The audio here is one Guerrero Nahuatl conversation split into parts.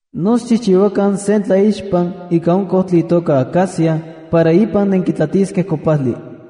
’No xchijchiuakan sen tlaixpan ika on kojtli itoka acacia para ipan nenkitlatiskej kopajli.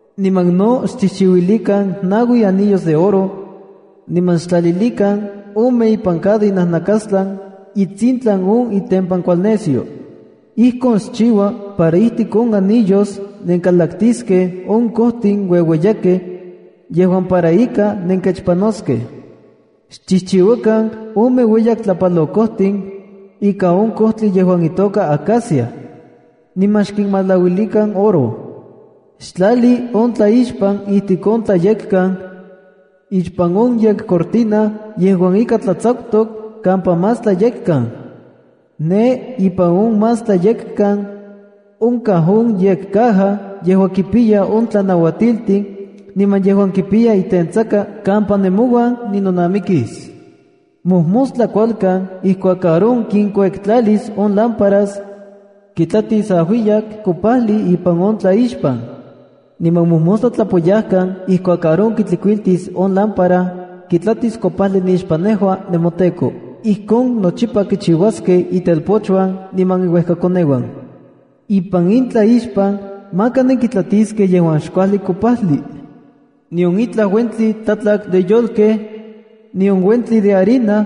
Niman no xchijchiuilikan naui anillos de oro, niman xtlalilikan ome ipan cada inajnakastlan itsintlan on itempankualnesyo. Ijkon xchiua para ijtik on anillos nenkalaktiskej on kojtin ueueyakej yejuan para ika nenkechpanoskej. Xchijchiuakan ome ueyak tlapalokojtin ika on kojtli yejuan itoka acacia, niman xkinmalauilikan oro. Xtlali on tlaixpan ijtik on Tlayekkan, ixpan on yekcortina yejuan ika tlatsakutok kampa Más Tlayekkan. Ne ipan on Más Tlayekkan, onkaj on yekcaja yejuan kipiya on tlanauatiltin niman yejuan kipiya itentsaka kampa nemouan ninonamikis. Mojmostla kualkan ijkuak Aarón kinkuektlalis on lámparas, kitlatis ajuiyak kopajli ipan on tlaixpan. Niman mojmostla tlapoyajkan, ijkuak Aarón kitlikuiltis on lámpara, kitlatis kopajli nixpan nejua, nemoTEKO. Ijkon nochipa kichiuaskej itelpochuan niman iuejkakoneuan. Ipan in tlaixpan, maka nenkitlatiskej yejuan xkuajli kopajli, nion itlaj uentli tlatlak de yolkej, nion uentli de harina,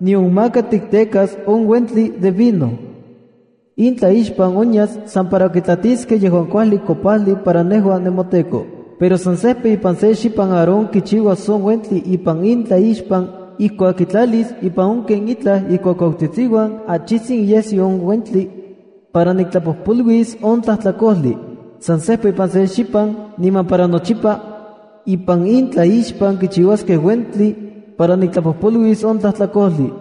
nion maka tiktekas on uentli de vino. In tlaixpan onyas san para kitlatiskej yejuan kuajli kopajli para nejua nemoTEKO. Pero san sejpa ipan se xipan Aarón kichiuas on uentli ipan in tlaixpan ijkuak kitlalis ipan on ken itlaj ikuakuautsitsiuan achijtsin iyesyo on uentli para niktlapojpoluis on tlajtlakojli. San sejpa ipan se xipan, niman para nochipa, ipan in tlaixpan kichiuaskej uentli para niktlapojpoluis on tlajtlakojli.”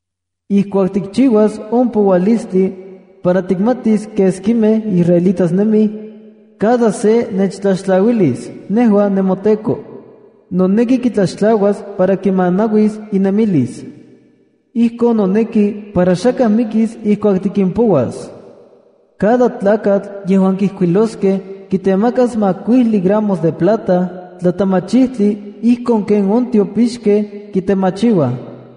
’Ijkuak tikchiuas on poualistli para tikmatis keskimej israelitas nemij, cada se nechtlaxtlauilis, nejua nemoTEKO. Noneki kitlaxtlauas para kimanauis inemilis. Ijkon noneki para xakaj mikis ijkuak tikimpouas. Cada tlakatl yejuan kijkuiloskej kitemakas makuijli gramos de plata tlatemachijtli ijkon kech on tiopixkej kitemachiuaj.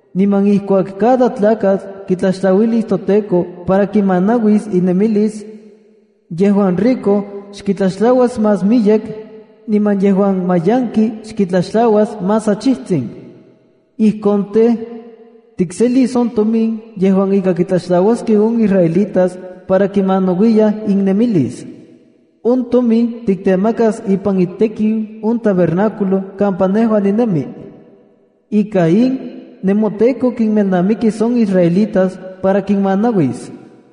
Niman ijkuak cada tlakatl kitlaxtlauilis toTEKO para kimanauis inemilis, yejuan rico xkitlaxtlauas más miyek, niman yejuan mayanki xkitlaxtlauas más achijtsin. Ijkon tej, tikselis on tomin yejuan ika kitlaxtlauaskej on israelitas para kinmanauiyaj innemilis. On tomin tiktemakas ipan itekiu on tabernáculo kampa nejua ninemi. Ika in, nemoTEKO kimelnamikis on israelitas para kinmanauis.”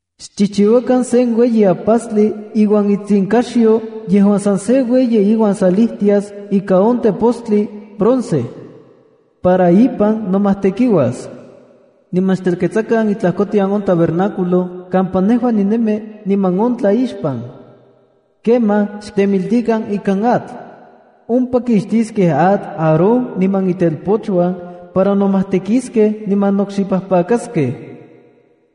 ’Xchijchiuakan sen ueyi ajpastli iuan itsinkaxyo yejuan san se ueyi iuan salijtias ika on tepostli bronce para ipan nomajtekiuas. Niman xtelketsakan itlajkotian on tabernáculo kampa nejua ninemi niman on tlaixpan. Kemaj xtemiltikan ikan atl. Ompa kixtiskej atl Aarón niman itelpochuan para nomajtekiskej niman nokxipajpakaskej.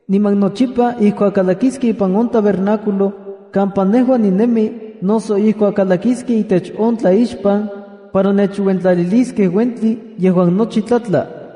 Niman nochipa ijkuak kalakiskej ipan on tabernáculo kampa nejua ninemi noso ijkuak uajlaskej itech on tlaixpan para nechuentlaliliskej uentli yejuan nochi tlatla,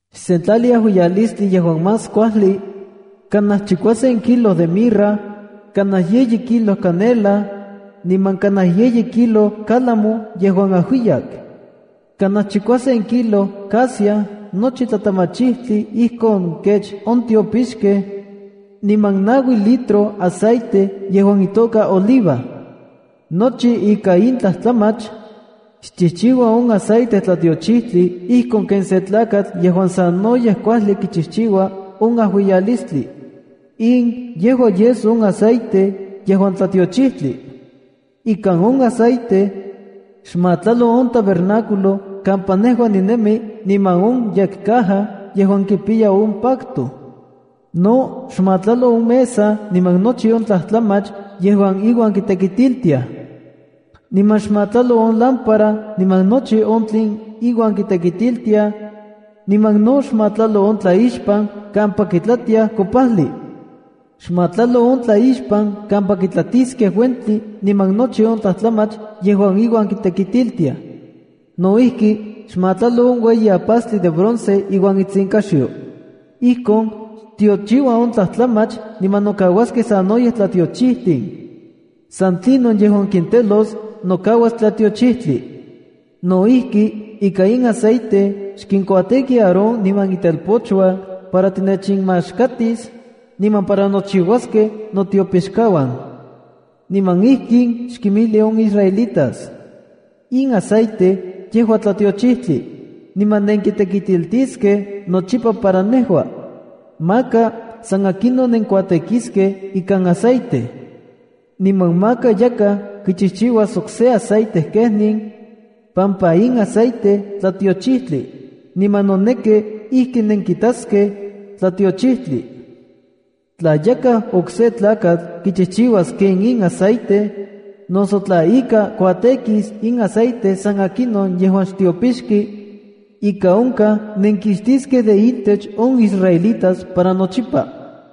“Xsentlali ajuiyalistli yejuan más kuajli: Kanaj chikuasen kilo de mirra, kanaj yeyi kilo canela, niman kanaj yeyi kilo cálamo yejuan ajuiyak, kanaj chikuasen kilo casia nochi tlatemachijtli ijkon kech on tiopixkej kitemachiuaj niman naui litro aceite yejuan itoka oliva. Nochi ika in tlajtlamach, xchijchiua on aceite tlatiochijtli ijkon ken sen tlakatl yejuan sanoyej kuajli kichijchiua on ajuiyalistli. In yejua yes on aceite yejuan tlatiochijtli. Ikan on aceite, xmatlalo on tabernáculo kampa nejua ninemi niman on yekcaja yejuan kipiya on pacto. No xmatlalo on mesa niman nochi on tlajtlamach yejuan iuan kitekitiltiaj, niman xmatlalo on lámpara niman nochi on tlen iuan kitekitiltiaj, niman no xmatlalo on tlaixpan kampa kitlatiaj kopajli. Xmatlalo on tlaixpan kampa kitlatiskej uentli niman nochi on tlajtlamach yejuan iuan kitekitiltiaj. No ijki, xmatlalo on ueyi ajpastli de bronce iuan itsinkaxyo. Ijkon xtiochiua on tlajtlamach niman nokauaskej sanoyej tlatiochijtin. San tlinon yejuan kintelos nokauas tlatiochijtli. ’No ijki, ika in aceite xkinkuatêki Aarón niman itelpochuan para tinechinmaxkatis niman para nochiuaskej notiopixkauan. Niman ijkin xkinmijli on israelitas: ‘In aceite yejua tlatiochijtli, niman nenkitekitiltiskej nochipa para nejua. Maka san akinon nenkuatêkiskej ikan aceite. Niman maka yakaj kichijchiuas okse aceite kenin, pampa in aceite tlatiochijtli, niman noneki ijki nenkitaskej tlatiochijtli. Tla yakaj okse tlakatl kichijchiuas ken in aceite, noso tla ika kuatêkis ikan aceite san akinon yejuan xtiopixki, ika onkaj nenkixtiskej de intech on israelitas para nochipa.’”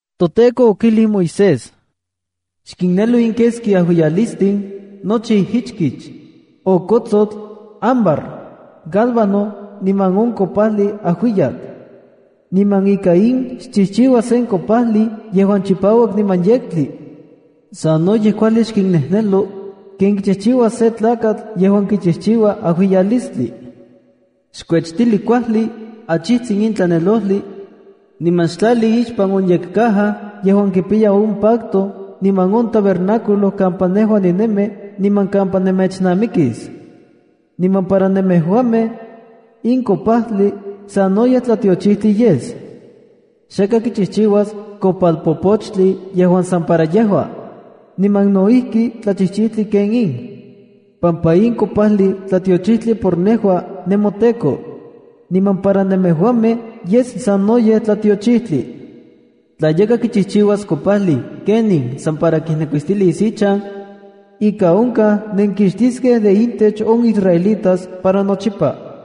ToTEKO okijli Moisés: “Xkinnejnelo in keski ajuiyalistin nochi ijichkich: okotsotl, ámbar, gálbano niman on kopajli ajuiyak. Niman ika in xchijchiua sen kopajli yejuan chipauak niman yektli. Sanoyej kuajli xkinnejnelo ken kichiua sen tlakatl yejuan kichijchiua ajuiyalistli. Xkuechtili kuajli achijtsin in tlanelojli, niman xtlali ixpan on yekcaja yejuan kipiya on pacto ipan on tabernáculo kampa nejua ninemi niman kampa nemechnamikis. Niman para nemejuamej, in kopajli sanoyej tlatiochijtli yes. Xakaj kichijchiuas kopalpopochtli yejuan san para yejua, niman no ijki tlachijchijtli ken in, pampa in kopajli tlatiochijtli por nejua, nemoTEKO. Niman para nemejuamej yes sanoyej tlatiochijtli. Tla yakaj kichijchiuas kopajli ken in san para kijnekuistilis ichan, ika onkaj nenkixtiskej de intech on israelitas para nochipa.”